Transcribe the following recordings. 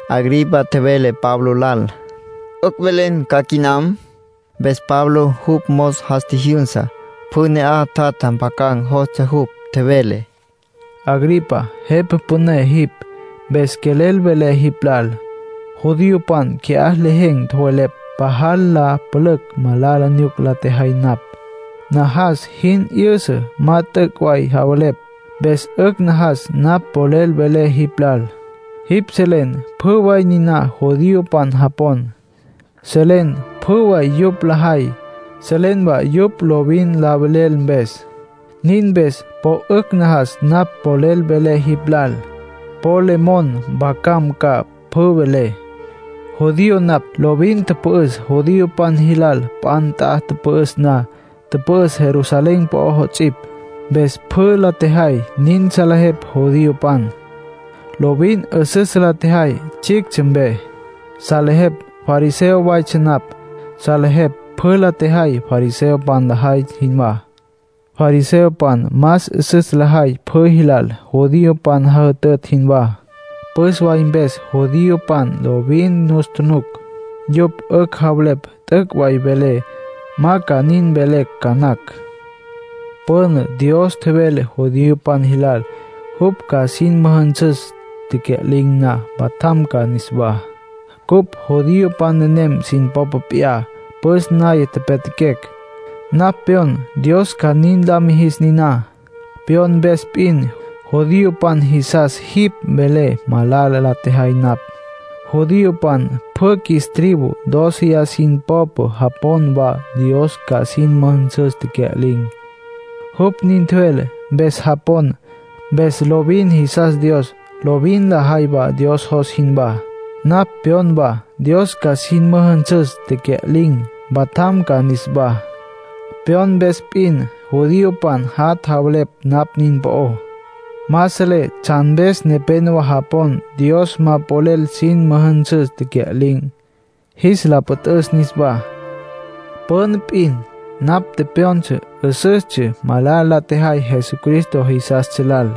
Agripa tjevele Pablo lal: —'Ücj mvelen ca quinam. Mpes Pablo jupj mos jas tjijyünsa; pjü ne'aj tjatja mpjacan̈ jostsja jupj. Tjevele: —Agripa, jepa püné jipj, mpes quelel velé jipj lal. Judiopan qui'á lejen̈ tjowelepj pajal la pülücj malala nyuca la tjejay napj. Najas jin 'yüsa ma t'üc' way javelepj. Mpes 'ücj najas napj polel velé jipj lal. Jipj selen pjü way niná judiopan japon. Selen pjü way yupj lajay. Selen wa yupj lovin la velel mpes. Nin mpes po 'ücj najas napj polel velé jipj lal. Po le mon mpjacam ca pjü velé. ”Judío napj. Lovin tüpü'üs judiopan jilal p'a nt'a tüpü'üs na. Tüpü'üs Jerusalén po'ó 'ots'ipj. Mpes pjü la tjejay nin salejepj judiopan. Lovin 'üsüs la tjejay tsjictsja mpe. Salejepj fariseo waytsja napj. Salejepj pjü la tjejay fariseopan lajay jinwá. Fariseopan más 'üsüs lajay pjü jilal judiopan jajütütj jinwá. Püs way mpes judiopan lovin nus tjunuc. Yupj 'ücj javelepj t'üc' way velé. Ma ca nin mvelecj ca nacj. ”Püna Dios tjevele judiopan jilal jupj ca sin müjünsüs tecya'lin̈, mpatjam ca niswá. Cupj judiopan nenem sin popa p'iyá püs naya pyatjaquecj. Napj pyon Dios ca nin la mijis niná. Pyon mpes p'in, judiopan jisas jipj mvelen malala la tjejay napj. Judiopan pjü qjuis tribu dóceya sin popé japon wa Dios ca sin müjünsüs tecya'lin̈. Jupj nin tjevele, mpes japon. Mpes lovin jisas Dios, lovin lajay Dios jos jinwá. Napj pyon wa Dios ca sin müjünsüs tecya'lin̈, mpatjam ca niswá. Pyon mpes p'in, judiopan jat' javelepj napj nin po'ó. Ma selé tsjan mpes nepénowa japon Dios ma polel sin müjünsüs tecya'lin̈, jis la püt'üs niswá. ”Püna p'in napj tepyon 'üsüstsja malala la tjejay Jesucristo jisastsja jilal,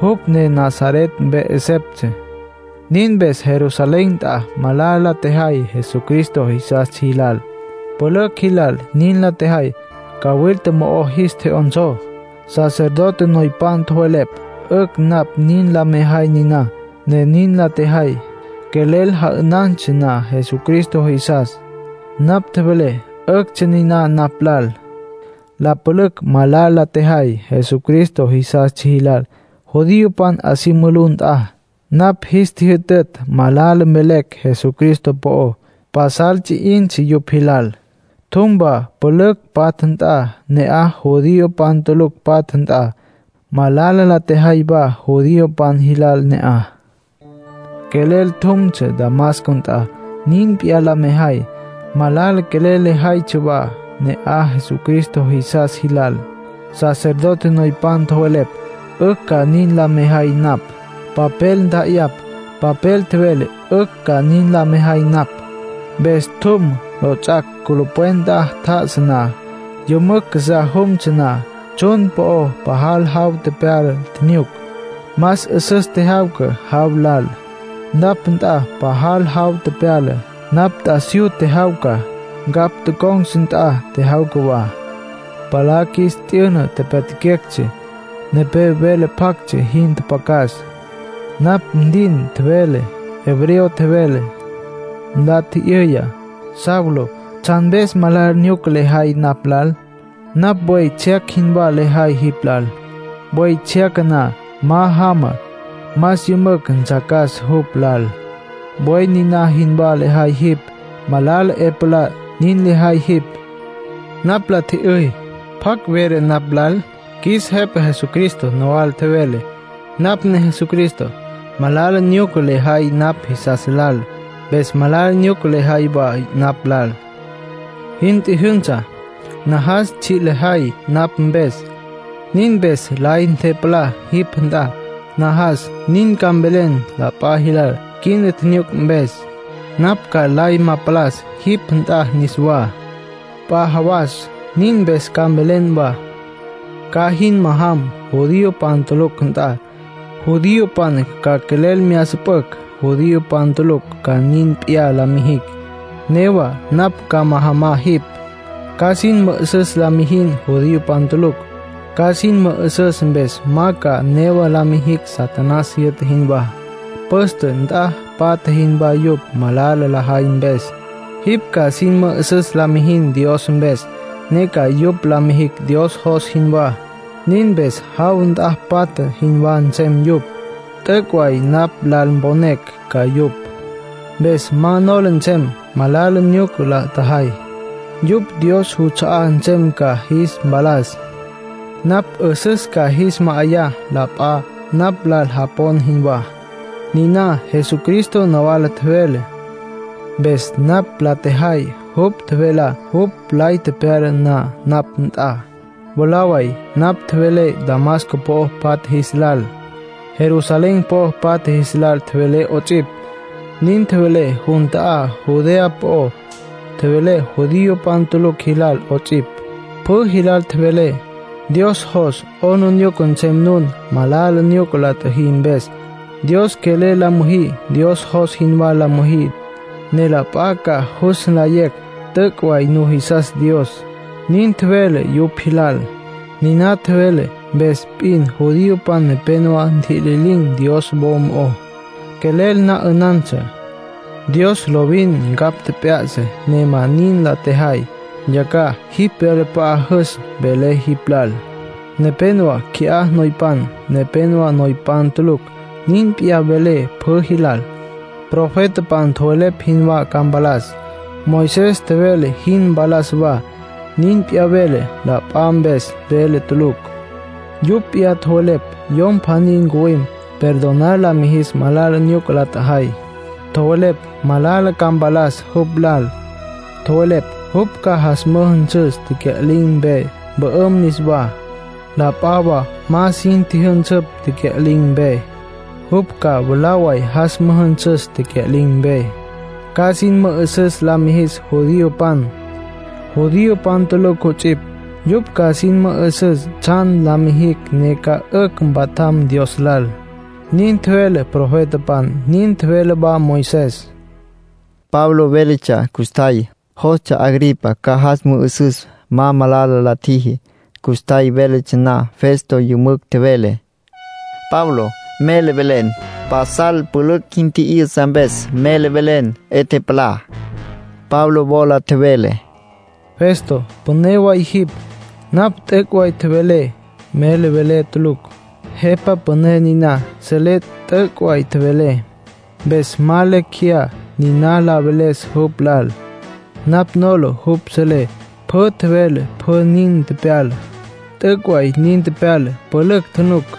jupj ne Nazaret mpe 'esepj. Nin mpes Jerusalén nt'a malala la tjejay Jesucristo jisastsja jilal. Pülücj jilal nin la tjejay. Cawilta mo'o jis tje'yonsó. Sacerdote noypan tjowelepj 'ücj napj nin la mejay niná, ne nin la tjejay. Quelel ja'ünantsja na Jesucristo jisas, napj tjevelé 'üctsja niná napj lal. La pülücj malala la tjejay Jesucristo jisastsja jilal judiopan 'a si mulú nt'a. Napj jis tjijyütütj malala mvelecj Jesucristo po'ó. Pasal ts'i 'intsja yupj jilal. Tjum wa pülücj patja nt'a, ne'aj judiopan tulucj patja nt'a, malala la tjejay wa judiopan jilal ne'aj. ”Quelel jumtsja Damasco nt'a nin p'iyá la mejay. Malala quelel lejaytsja wa ne'aj Jesucristo jisas jilal. Sacerdote noypan tjowelepj 'ücj ca nin la mejay napj. Papel ntja'ayapj, papel tjevele 'ücj ca nin mejay napj. Mpes tjum. Lots'ac' culupwen nt'a tjá'asa na, jümücj casá jumtsja na, tsjun po'o pajal jaw tepyala tjinyuc. Más 'üsüs tjejyawca jaw lal. Napj nt'a pajal jaw tepyala, napj t'asiyú tjejyawca. Ncapj tocon̈tsja nt'a tjejyawca wa. Palá qjuis tyü'na, tepyatjaquectsja. Nepé vele pactsja jin tjapjacas. Napj ntin tjevele, hebreo tjevele. Nla tji'yüya: ‘Saulo, ¿tsjan mpes malala nyuca lejay napj lal? Napj buey tsjyac jinwá lejay jipj lal. Buey tsjyaca na ma jama, más yümücj ntsjacas jupj lal. Buey niná jinwá lejay jipj. Malala 'e palá nin lejay jipj.’ ”Napj la tji'yüy: ‘¿Pjacj vele napj lal?’ Qjuis Jepa Jesucristo nawala tjevele: ‘Napj ne Jesucristo. Malala nyuca le jay napj jisas lal. Mpes malala nyuca lejay wa napj lal. Jin tjijyünsa. Najas tsji' lejay napj mpes. Nin mpes lay ntepalá jipj nt'a. Najas nin ca mvelen la p'a jilal quina tjinyuc mpes. Napj ca lay ma palas jipj nt'a niswá, p'a jawas. Nin mpes ca mvelen wa. Ca jin majam judiopan tulucj nt'a. Judiopan ca quelel mya süpücj, judiopan tulucj ca nin p'iyá la mijicj, newa napj ca majamá jipj. Ca sin mü'üsüs la mijin judiopan tulucj. Ca sin mü'üsüs mpes ma ca newa la mijicj Satanás jyü'ta jinwá. Püste nt'a patja jinwá yupj malala lajay mpes. Jipj ca sin mü'üsüs la mijin Dios mpes, ne ca yupj la mijicj Dios jos jinwá. Nin mpes jaw nt'a patja jinwá nsem yupj. T'üc' way napj lal mponecj ca yupj, mpes ma nola nsem malala nyuca la tjajay. Yupj Dios juts'a'á nsem ca jis mpalas. Napj 'üsüs ca jis ma'ayá, la p'a napj lal japon jinwá’, niná Jesucristo nawala tjevele. ”Mpes napj la tjejay jupj tjevelá jupj lay tepyala na napj nt'a. Mwalá way napj tjevelé Damasco po'o patja jis lal. Jerusalén po'o patja jis lal tjevelé 'ots'ipj. Nin tjevelé jun ta'á Judea po'ó. Tjevelé judiopan tulucj jilal 'ots'ipj. Pjü jilal tjevelé: ‘Dios jos 'aplijila nsem nun malala nyuca la tjüjí mpes. Dios quelel la müjí. Dios jos jinwá la müjí, ne la p'a ca jus nlayecj t'üc' way nujisas Dios’, nin tjevelé yupj jilal. ”Niná tjevelé mpes p'in judiopan nepenowá ntjitjililin̈ Dios wo mo'ó. Quelel na 'ünantsja. Dios lovin ncapj tjep'yá'satsja ne ma nin la tjajay. Yacjaj jipj wyalap'a'á jüs, velé jipj lal. Nepénowa qui'á noypan, nepénowa noypan tulucj. Nin p'iyá velé pjü jilal. Profetapan tjowelepj jinwá ca mpalas. Moisés tjevele jin mpalas wa. Nin p'iyá velé. La p'a mpes velé tulucj. Yupj p'iyá tjowelepj Yom pjaní ncuwim perdonar lis mijis malala nyuca la tjajay. Tjowelepj malala ca mpalas jupj lal. Tjowelepj jupj ca jas müjünsüs tecya'lin̈ mpe, mpü'üm niswá. La p'a wa ma sin tjüjünsüpj tecya'lin̈ mpe. Jupj ca mwalá way jas müjünsüs tecya'lin̈ mpe. Ca sin mü'üsüs la mijis judiopan, judiopan tulucj 'ots'ipj. Yupj ca sin mü'üsüs tsjan la mijicj ne ca 'ücj mpatjam Dios lal. Nin tjevele profetapan. Nin tjevele wa Moisés. Pablo véletsja custjay, jostsja Agripa ca jas mü'üsüs ma malala la tjiji. Custjay véletsja na, Festo yümücj tjevele: —Pablo, ¡mele velen! Pasal pülücj jin tji'yüsa, mpes mele velen 'e tepalá. Pablo wola tjevele: —Festo, püné way jipj. Napj t'üc' way tjevelé. Mele velé tulucj. Jepa püné niná selé t'üc' way tjevelé. Mpes ma lecj jeyá nin la veles jupj lal. Napj nola jupj selé pjü tjevelé pjü nin tepyala. T'üc' way nin tepyala, pülücj tjunuc.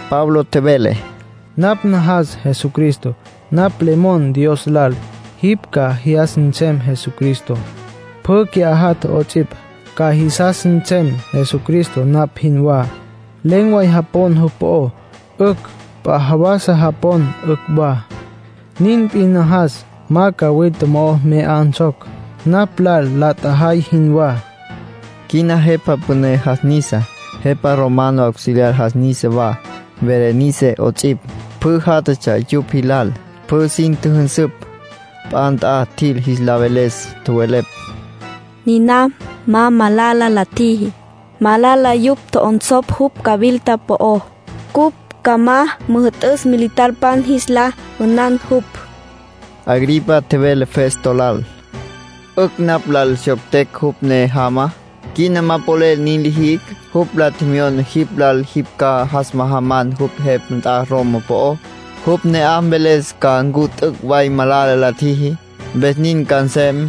Pablo tjevele: —Napj najas Jesucristo. Napj le mon Dios lal jipj ca jyas nsem Jesucristo, pjü qui'á jatja 'ots'ipj, ca jisas nsem Jesucristo napj jinwá. Len̈ way japon jupj po'ó, 'ücj. P'a jawasa japon, 'ücj wa. Nin p'in najas ma cawilta mo'o mya 'onsocj, napj lal la tjajay jinwá —Pablo nin tjevele. Quina jepa püné jas nisa. Jepa romano auxiliar jas nisa wa, Berenice 'ots'ipj, pjü játjatsja yupj jilal, pjü sin tjüjünsüpj. P'a nt'a tjil jis la veles. Tjowelepj: —Niná ma malala la tjiji. Malala yupj tjo'onsopj jupj cawilta po'ó. Cupj ca ma müjü'tücj militarpan jis la 'ünan jupj. Agripa tjevele Festo lal: —'Ücj napj lal syoctecj jupj ne jama. Quina ma polel nin li jicj. Jupj la tjemyona jipj lal jipj ca jas majaman jupj jepa nt'a Roma po'ó, jupj ne'aj mveles ca ncu t'üc' way malala la tjiji. Mpes nin ca nsem.